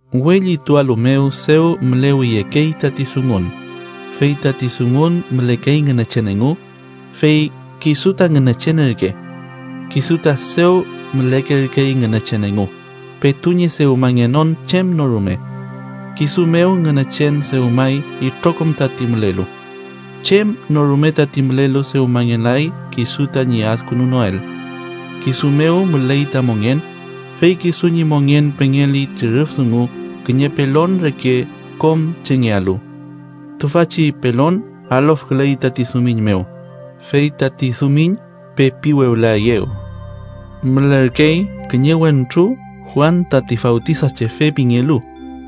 We llitualu mew dew mülewiyekey tati Dungun, fey tati Dungun mülekey Ngünechen engu, fey kisu ta Ngünechen ürke. Kisu ta dew mülekerkey Ngünechen engu, petu ñi dewmangenon chem no rume. Kisu mew Ngünechen dewmay itrokom tati mülelu. Chem no rume tati mülelu, dewmangelay kisu tañi adkünunoel. Kisu mew müley ta mongen, fey kisu ñi mongen pengeli ti rüf dungu kiñe pelon reke kom chengealu. Tüfachi pelon alofküley tati dumiñ mew, fey tati dumiñ pepi wewlaeyew. Mülerkey kiñe wentru Juan tati Fawtisachefe pingelu,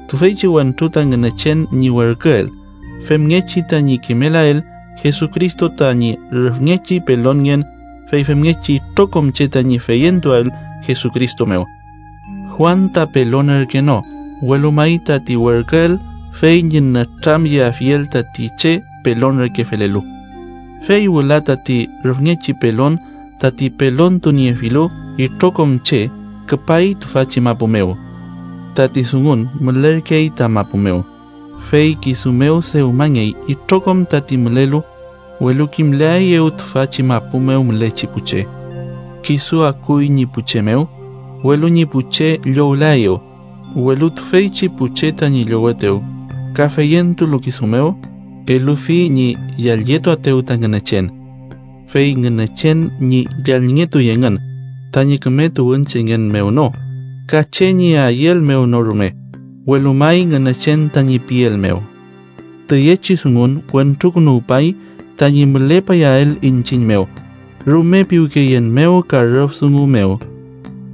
tüfeychi wentru ta Ngünechen ñi werküel femngechi tañi kimelael Jesucristo tañi rüfngechi pelonngen, fey femngechi itrokom che tañi feyentuael Jesucristo mew. Juan ta pelon ürke no, welu may tati werküel fey ñi nütramyeafiel tati che pelon reke felelu. Fey wüla tati rüfngechi pelon tati pelontuniefilu itrokom che küpay tüfachi mapu mew. Tati Dungun mülerkey ta mapu mew, fey kisu mew dewmangey itrokom tati mülelu, welu kimlaeyew tüfachi mapu mew mülechi pu che. Kisu akuy ñi pu che mew, welu ñi pu che llowlaeyew, welu tüfeychi pu che tañi llowetew ka feyentulu kisu mew, elufi ñi yallyetuaetew ta Ngünechen. Fey Ngünechen ñi yallngetuy engün, tañi küme tuwünchengen mew no, ka che ñi ayüel mew no rume, welu may Ngünechen tañi piel mew. Tüyechi Dungun Wentrukünuwpay tañi mülepayael iñchiñ mew, rume piwkeyen mew ka rüf dungu mew.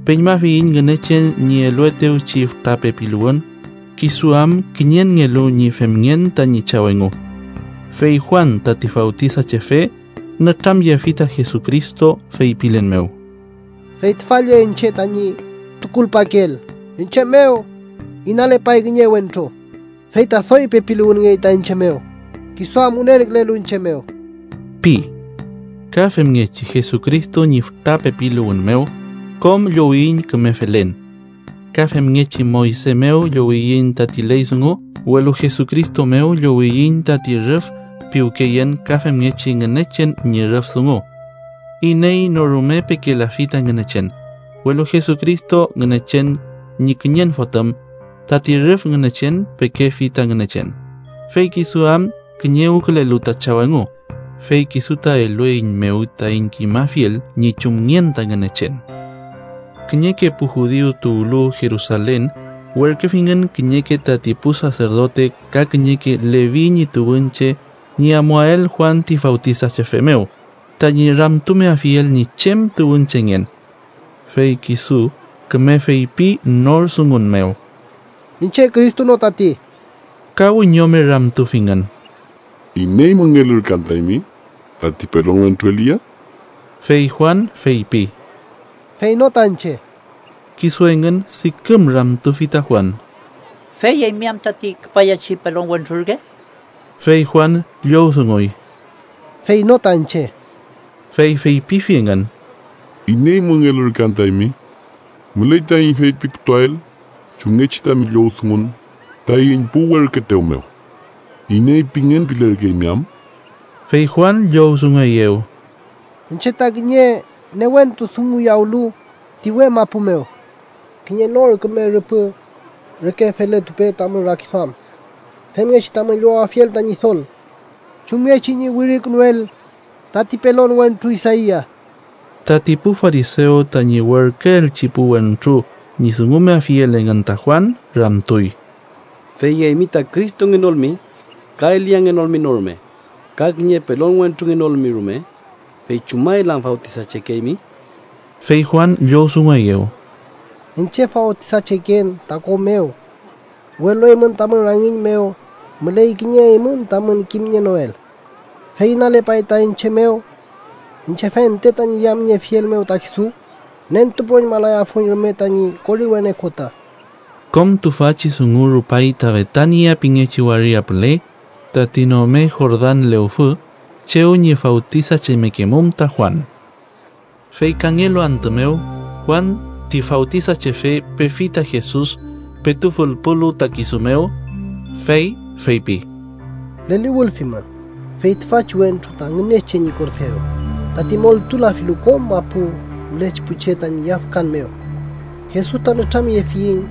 Peñmafiyiñ Ngünechen ñi eluetewchi fütra pepiluwün kisu am kiñenngelu ñi femngen tañi Chaw engu. Fey Juan tati Fawtisachefe nütramyefi ta Jesucristo, feypilen mew: “Fey tüfa lle iñche tañi tukulpakeel: iñche mew inalepay kiñe wentru, fey ta doy pepiluwünngey ta iñche mew, kisu am wünenkülelu iñche mew” pi. Ka femngechi Jesucristo ñi fütra pepiluwün mew, kom llowiyiñ küme felen. Ka femngechi Moyse mew llowiyiñ tati ley dungu, welu Jesucristo mew llowiyiñ tati rüf piwkeyen ka femngechi Ngünechen ñi rüf dungu. Iney no rume pekelafi ta Ngünechen, welu Jesucristo, Ngünechen ñi kiñen Fotüm, tati rüf Ngünechen, pekefi ta Ngünechen, fey kisu am kiñewkülelu ta Chaw engu, fey kisu ta elueiñmew taiñ kimafiel ñi chumngen ta Ngünechen. Kiñeke pu judiu tuwlu Jerusalen werküfingün kiñeke tati pu saserdote ka kiñeke Levi ñi tuwünche ñi amuael Juan ti Fawtisachefe mew tañi ramtumeafiel ñi chem tuwünchengen. Fey kisu küme feypi nor dungun mew: —Iñche Cristo no tati. Ka wiñome ramtufingün: —¿Iney müngell ürke anta eymi? ¿Tati pelon wentru Elia? Fey Juan feypi: —Fey no ta iñche. Kisu engün diküm ramtufi ta Juan: —Fey ¿eymi am tati küpayachi pelon wentru ürke? Fey Juan llowdunguy: —Fey no ta iñche. Fey feypifi engün: —¿Iney müngell ürke anta eymi? Müley taiñ feypiputuael chumngechi tami llowdungun taiñ pu werküetew mew. ¿Iney pingen pilerkeymi am? Fey Juan llowdungueyew: —Iñche ta kiñe newentu dunguyawlu ti uwe mapu mew: ‘Kiñe nor küme rüpü reke feletupe tamün rakiduam, femngechi tamün llowafiel ta Ñidol’ chumngechi ñi wirikünuel tati pelon wentru Isaia. Tati pu farisew tañi werküelchi pu wentru ñi dungumeafiel engün ta Juan ramtuy: —Fey eymi ta Cristongenolmi, ka Eliangenolmi no rume ka kiñe pelon wentrungenolmi rume, ¿fey chumael am fawtisachekeymi? Fey Juan llowdungueyew: —Iñche fawtisacheken ta ko mew, welu eymün tamün rangiñ mew müley kiñe eymün tamün kimnienoel. Fey inalepay ta iñche mew. Iñche fente tañi yamniefiel mew ta kisu, nentupüroñmalayafuiñ rume tañi koriwen okota. Kom tüfachi dungu rupay ta Betania pingechi waria püle, tati nome Jordan lewfü, chew ñi fawtisachemekemum ta Juan. Fey kangelu antü mew, Juan ti Fawtisachefe pefi ta Jesus, petu fülpulu ta kisu mew, fey feypi: “¡Leliwülfimün, fey tüfachi wentru ta Ngünechen ñi Korderu, tati montulafilu kom mapu mülechi pu che tañi yafkan mew! Jesus ta nütramyefiñ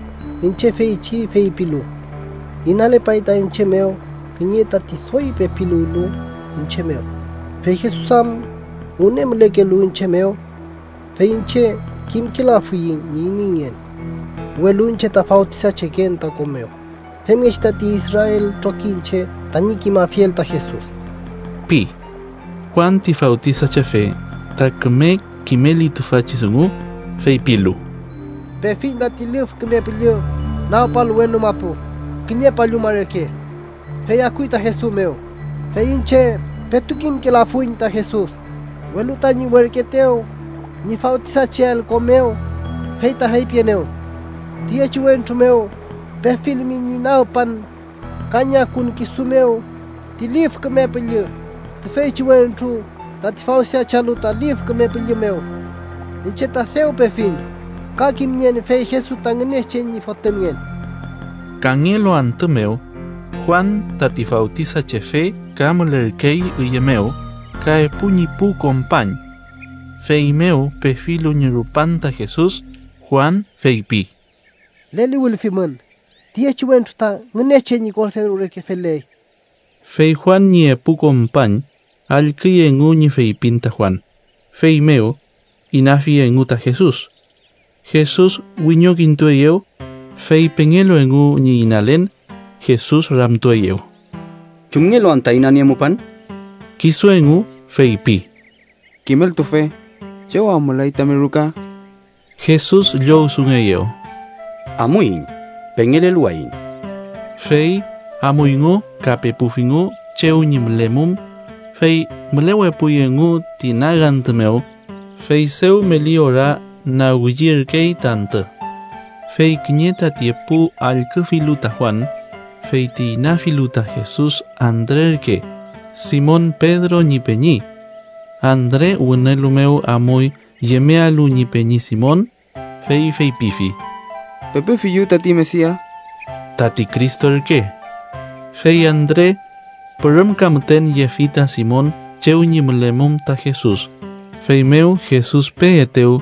iñche feychi feypilu: ‘Inalepay ta iñche mew kiñe tati doy pepiluwlu iñche mew, fey Jesus am wüne mülekelu iñche mew.’ Fey iñche kimkelafuiñ ñi ineyngen. Welu iñche ta fawtisacheken ta ko mew, femngechi tati Israel trokiñche tañi kimafiel ta Jesus” pi. Juan ti Fawtisachefe ta küme kimeli tüfachi dungu, feypilu: “Pefiñ tati Lif Küme Püllü nagpalu wenu mapu kiñe palluma reke, fey akuy ta Jesus mew, fey iñche petu kimkelafuiñ ta Jesus, welu tañi werküetew ñi fawtisacheael ko mew fey ta feypienew: ‘Tüyechi wentru mew pefilmi ñi nagpan ka ñi akun kisu mew ti Lif Küme Püllü, tüfeychi wentru tati fawtisachealu ta Lif Küme Püllü mew.’ Iñche ta dew pefiñ, ka kimnien, fey Jesus ta Ngünechen ñi Fotümngen.” Kangelu antü mew, Juan tati Fawtisachefe ka mülerkey üye mew ka epu ñi pu kompañ. Feymew pefilu ñi rupan ta Jesus, Juan feypi: —¡Leliwülfimün, tüyechi wentru ta Ngünechen ñi Korderu reke feley! Fey Juan ñi epu kompañ allküy engu ñi feypin ta Juan, feymew inafi engu ta Jesus. Jesus wiñokintueyew, fey pengelu engu ñi inalen, Jesus ramtueyew: —¿Chumngelu anta inaniemupan? Kisu engu feypi: —Kimeltufe ¿chew am müley tami ruka? Jesus llowdungueyew: —Amuiñ. Pengeleluwayiñ. Fey amuyngu ka pepufingu chew ñi mülemum, fey mülewepuy engu ti nagantü mew, fey dew meli ora nagwiyerkey ta antü. Fey kiñe tati epu allküfilu ta Juan, feyti inafilu ta Jesus Andre ürke, Simon Pedro ñi peñi. Andre wünelu mew amuy yemealu ñi peñi Simon, fey feypifi: —Pepefiyu tati Mesia (tati Cristo ürke). Fey Andre pürümka müten yefi ta Simon chew ñi mülemum ta Jesus, feymew Jesus peetew,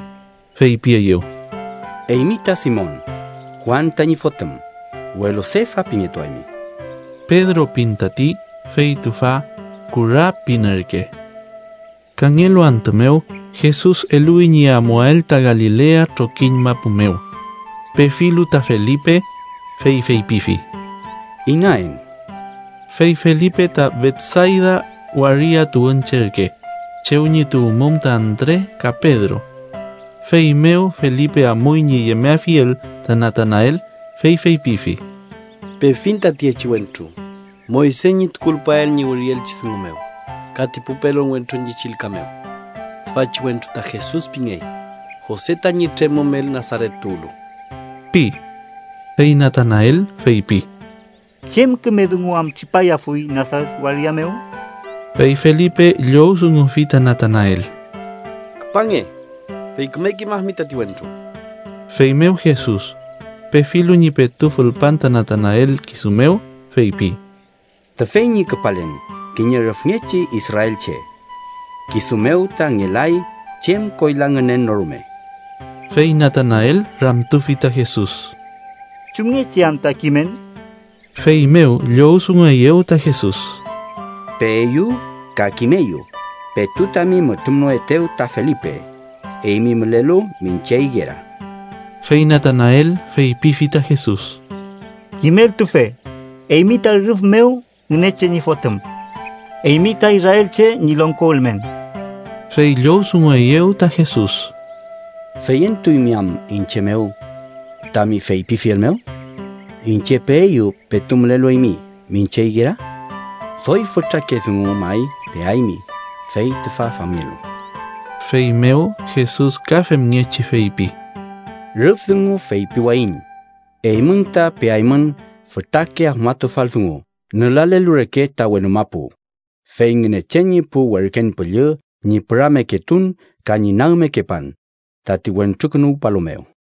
feypieyew: —Eymi ta Simon, Juan tañi fotüm, welu Sefa pingetuaymi (Pedro pin tati, fey tüfa “kura” pin ürke). Kangelu antü mew, Jesus eluwi ñi amuael ta Galilea trokiñ mapu mew. Pefilu ta Felipe, fey feypifi: —Inaen. Fey Felipe ta Betsayda waria tuwünche ürke, chew ñi tuwmum ta Andre ka Pedro. Feymew Felipe amuy ñi yemeafiel ta Natanael, fey feypifi: —Pefiñ ta tüyechi wentru, Moyse ñi tukulpael ñi wirielchi dungu mew, ka ti pu pelon wentru ñi chillka mew. Tüfachi wentru ta Jesus pingey, Jose tañi tremümel Nasaret tuwlu ―pi. Fey Natanael feypi: —¿Chem küme dungu am tripayafuy Nasaret waria mew? Fey Felipe llowdungufi ta Natanael: —Küpange, fey küme kimafimi tati wentru. Feymew Jesus, pefilu ñi petu fülpan ta Natanael kisu mew, feypi: —Tüfey ñi küpalen kiñe rüfngechi israelche. Kisu mew ta ngelay chem koyla ngünen no rume. Fey Natanael ramtufi ta Jesus: —¿Chumngechi anta kimen? Feymew llowdungueyew ta Jesus: —Peeyu ka kimeyu petu tami mütrümnoetew ta Felipe, eymi mülelu miñche igera. Fey Natanael feypifi ta Jesus: —Kimeltufe, ¡eymi ta rüf mew Ngünechen ñi Fotüm! ¡Eymi ta israelche ñi longko ülmen! Fey llowdungueyew ta Jesus: —¿Feyentuymi am iñche mew tami feypifiel mew ‘iñche peeyu petu mülelu eymi miñche igera’? Doy fütrake dungu may peaymi fey tüfa famngelu. Feymew Jesus ka femngechi feypi: —Rüf dungu feypiwayiñ eymün ta peaymün fütrake afmatufal dungu nülalelu reke ta wenu mapu, fey Ngünechen ñi pu werken püllü ñi pürameketun ka ñi nagmekepan, tati Wentrukünuwpalu mew.